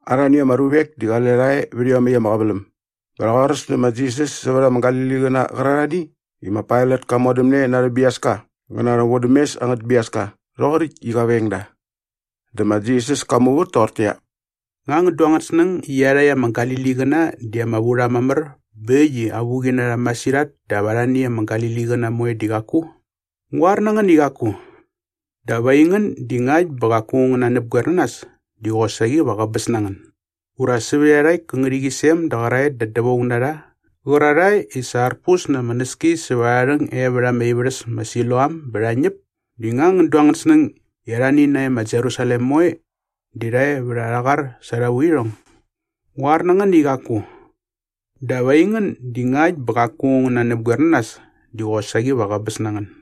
Arhani ama ruvek di qale rha e vät iomäkt ama qäväläm bä rha qoaräs nä ma Jisas sävät ama Galiliqäna qärarhani i ma Pailat ka modämne na arhä biaska ngä na arhä vodämes angät biaska rhoqoräkt i qa veng da. Dä ma Jisas ka muvät toqortäqyia, “Nga ngän du angän snäng i iarhakt ama Galiliqäna di ama vu rha mamär bä äkt i avuqi na rha masirhat dap arhani ama Galiliqäna moe di qaku? Ngu qoar na ngän i qaku! Dap aingän di ngakt bä qaku ngän nanäpgoer na nas di qosaqi va qäbäs na ngän. Ura sävät iarhakt kä ngärhäqyisem da qäraet da dävaung na rha qärarhae i sa arpus na ama näski sävät arha rhäng e vät ama ivärhäs ma Siloam bä rha ñäp di nga ngän du angän snäng i arhani nae ma Jerusalem moe di rha e vät arha qar sa arha vuirhong? Ngu qoar na ngän i qaku! Dap aingän di ngakt bä qaku ngän nanäpgoer na nas di qosaqi va qäbäs na ngän.”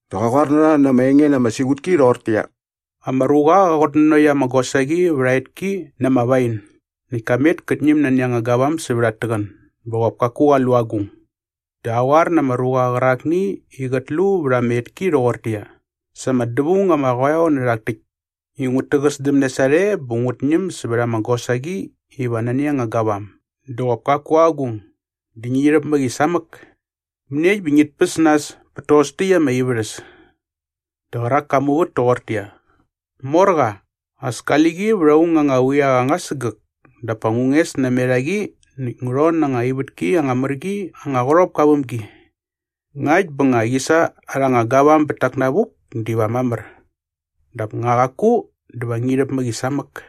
Dä qa qoar na rha na ama enge na ama siqutki rhoqortäqyia, “Ama ruqa qa qutnanokt ama gosaqi vät aa etki na ama wain näkt ka met kät ñäm nani anga gavam sävät at täqän bä qop kaku qa lu agung. Dä qa qoar na ama ruqa qärakni i qät lu vät ama etki rhoqortäqyia, ‘Sa ama dävaung ama qoeo nä rhak täkt i ngut täqäsdämne sarhe bä ngut ñäm sävät ama gosaqi iva nani anga gavam dä qop kaku agung dä ngi rhäp mä qi samäk! Mäniekt bä qit päs nas pät tos täkt ama ivärhäs?’” “Dä qärak ka muvät toqortäqyia, ‘Morqa, as kali qi vät aung anga quiaqa anga sägäk dap pa ngu nges namet a qi näkt ngu rhon na anga ivätki anga mär qi anga qärhopka väm gi. Ngakt bä nga qi sa arha anga gavam bät tak navuk diva mamär! Dap nga qaku dä va rhi rhäp mä qi samäk.’”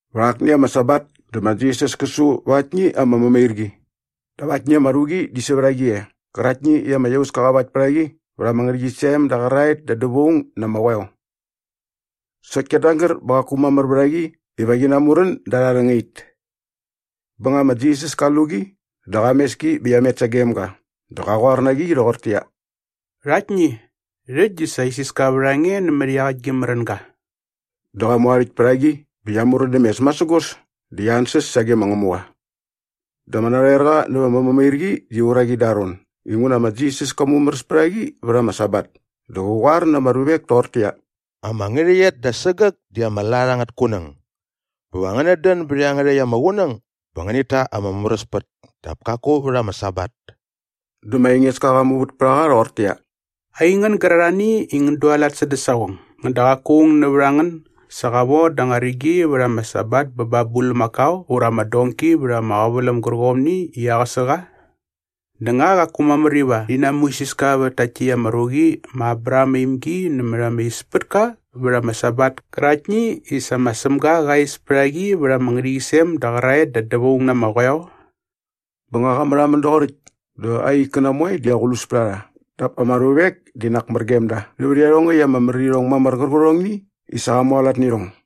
Vät akni ama Sabat dä ma Jisas kä su va aktni ama mämairqi dap aktni ama ruqi di sävät a qi e qäraktni i ama iauska qa vakt pät a qi vät ama ngärhäqyisem da qäraet da dävaung na ama qoeo. Sokt kiat nagär bä qaku mamär vät a qi iva qi namurän da arha rhängait. Bä nga ma Jisas ka lu qi dä qa mes ki bä qia met sagem ga dä qä qoar na qi rhoqortäqyia, “Rhaktni, rhäkt di sa isiska vät a nge nämät iaqäkt gi märänga.” Dä qa mu aa rhäkt pät a qi bä qia murän däm mes masägos dä qia ansäs sage ma Ngämuqa. Dä ama narhoerqa näva ama mämairqi di uraqi da aa ron inguna ma Jisas ka mumäräs pät a qi vät ama Sabat dä qä qoar na ama ruvek toqortäqyia, “Ama ngärhäqyet da sägäk di ama lat angät kunäng. Bä va ngänät dän bät iangärhäkt ama qunäng bä ngänit ta ama mumäräspät dap kaku vät ama Sabat.” Dä ma Engeska qa muvät pät a qa rhoqortäqyia, “Aingän gärarhani i ngän dualat sädä saqong, ngäda qaku aung nävät a ngän sa qa von da anga rigi vät ama Sabat bä ba aa bulmakao ura ama donki vät ama qäväläm gärqomni i aqäsä qa? Dä nga qaku mamär iva rhi namuisiska vät takt täkt ama ruqi ma Abraham aa imgi nämät arha ispätka vät ama Sabat käraktni i sa ma Sämga qa is pät a qi vät ama ngärhäqyisem da qäraet da dävaung na ama qoeo?” Bä nga qa märhamän doqoräkt dä aa ikkäna moe di aqlus pät a rha dap ama ruvek di nak mär gem da nävät iarhongäkt ama märirhong mamär qärqärhongni i sa qa mualat nä irhong.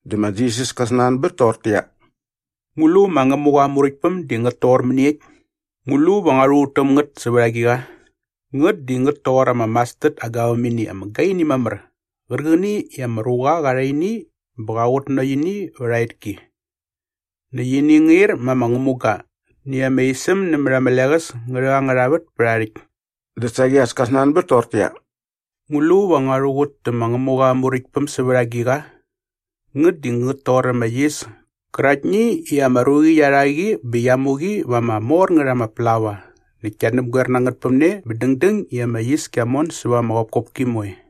Dä ma Jisas kä snanbät toqortäqyia, “Ngu lu ma Ngämuqa aa Muräktpäm di ngät toqor mäniekt? Ngu lu va ngua rhuqut täm ngät sävät agiqa? Ngät di ngät toqor ama mastard aa gavämini ama gaini mamär qärqäni i ama ruqa qa rha ini bä qa qutnanokt ini vät aa etki. Näkt ini ngä ir ma ama ngämuga näkt ama isäm nämät ama leqäs ngä rhäk angärha vät pät aa rhäkt.” Dä saqi as ka snanbät toqortäqyia, “Ngu lu va ngua rhuqut tä ma Ngämuqa aa Muräktpäm sävät agiqa? Ngät di ngät toqor ama yis käraktni i ama ruqi qia rha qi bä qia mu qi va ama mor ngät ama plaua näkt kia näpgoer na ngät päm ne bä dängdäng i ama yis kia mon säva ama qopkopki moe.”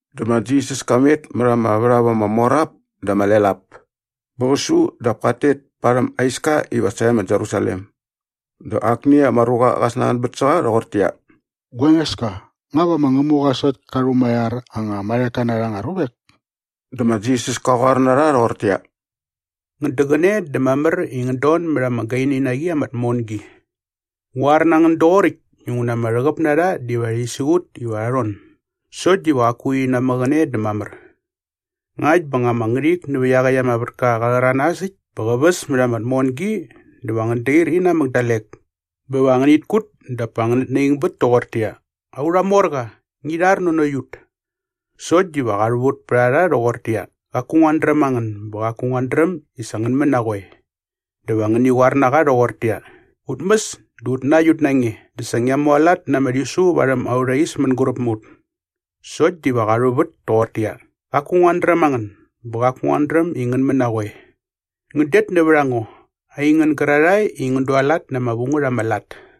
Dä ma Jisas ka met mät ama värhap ama mor ap dä ama lel ap bä qä su dap kat tet parhäm aa iska iva sae ma Jerusalem. Dä akni ama ruqa qa snanbät sä qa rhoqortäqyia, “Gua Engeska, nga va ma Ngämuqa sokt ka rhumaiar anga marheka na rha anga ruvek?” Dä ma Jisas ka qoar na rha rhoqortäqyia, “Ngän däqäne dä mamär i ngän don mät ama gaini na qi ama tmongi. Ngu qoar na ngän doqoräkt inguna ama rhäqäp na rha diva rhi siqut iva rha rhon sokt diva qaku rhi namäqäne dä mamär. Ngakt bä nga ama ngärhik nävä iaqäkt ama vätka qa rhäranas äkt bä qä väs mät ama tmongi dä va ngän dair inamäk dalek bä va ngänit kut dap pa ngänät naingbät toqortäqyia, ‘Aurha morqa, ngi rhar nanokt ut.’” “Sokt diva qa rhuvät pät a rha rhoqortäqyia, ‘Qaku nguat dräm a ngän bä qaku nguat dräm i sa ngän män na qoe.’” “Dä va ngäni qoar na qa rhoqortäqyia, ‘Ut mäs dä ut nakt ut na nge dä sa ngia mualat na ama rhisu varhäm aurha is mänguräp mä ut.’” “Sokt diva qa rhuvät toqortäqyia, ‘Qaku nguat dräm a ngän bä qaku nguat dräm i ngän män na qoe. Ngän det nävät a ngo aingän gärarhae i ngän dualat na ama vu ngät ama lat!’”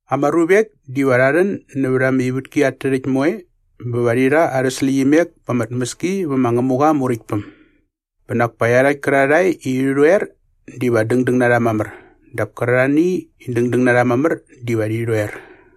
Ama ruvek diva rha rhän nävät ama ivätki at tärhäkt moe bä va rhi rha arhä släqyimek pa ama tmäski vä ma Ngämuqa aa Muräktpäm. Bä nak pa iarhakt kärarhae i rhi rhoer diva dängdäng na rha mamär dap kärarhani i dängdäng na rha mamär diva rhi rhoer.”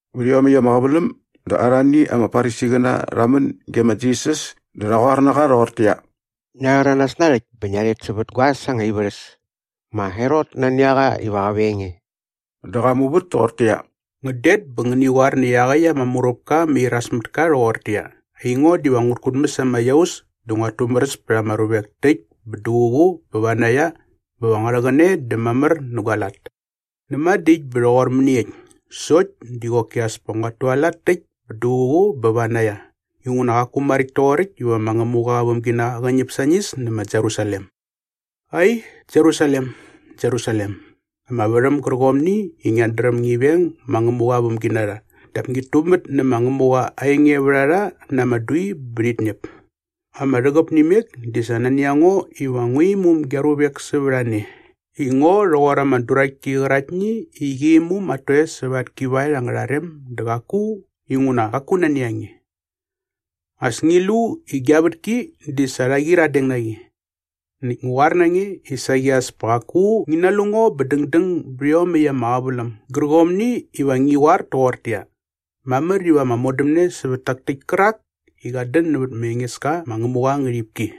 Vät iomäkt ama qäväläm dä arhani ama Farisiqäna rha män ge ma Jisas dä rha qoar na qa rhoqortäqyia, “Ngia rhäranas narhäkt bä ngia rhet sävät guaäs anga ivärhäs. Ma Herot nani a qa iva qä veng nge.” Dä qa muvät toqortäqyia, “Ngän det bä ngäni qoar nä iaqäkt ama muräpka ama iras mät ka rhoqortäqyia, ‘Aingo diva ngut kutmäs ama iaus dä nguat tumäräs pät ama ruvek täkt bä duququ bä vanaia bä va ngua rhäqäne dä mamär nä gua lat.’ Näma dä äkt bä rhoqor mäniekt sokt di qoki as pa nguat tualat täkt bä duququ bä vanaia inguna qaku maräkt toqoräkt iva ma Ngämuqa aa vämginaqa qä ñäp sañis nä ma Jerusalem.” “Ai, Jerusalem, Jerusalem, ama värhäm gärqomni i ngiat dräm ngi veng ma Ngämuqa aa vämginarha dap ngit tumät nä ma Ngämuqa aa engevärharha na ama dui bä rhit ñäp. Ama rhäqäp nä imek di sa nani a ngo iva ngu imum gia ruvek sävät a ne i ngo rhoqor ama duraktki qäraktni i qi imum at toes säva at kivaet angärha rem dä qaku inguna qaku nani a nge. As ngi lu i gia vätki di sa rha qyiradeng na qi. Näkt ngu qoar na nge i saqi as pa qaku ngi nalu ngo bä dängdäng bät iomäkt ama qäväläm gärqomni iva ngi qoar toqortäqyia, ‘Mamär iva ama modämne sävät tak täkt kärak i qat dän nävät ma Engeska ma Ngämuqa aa ngärhipki.’”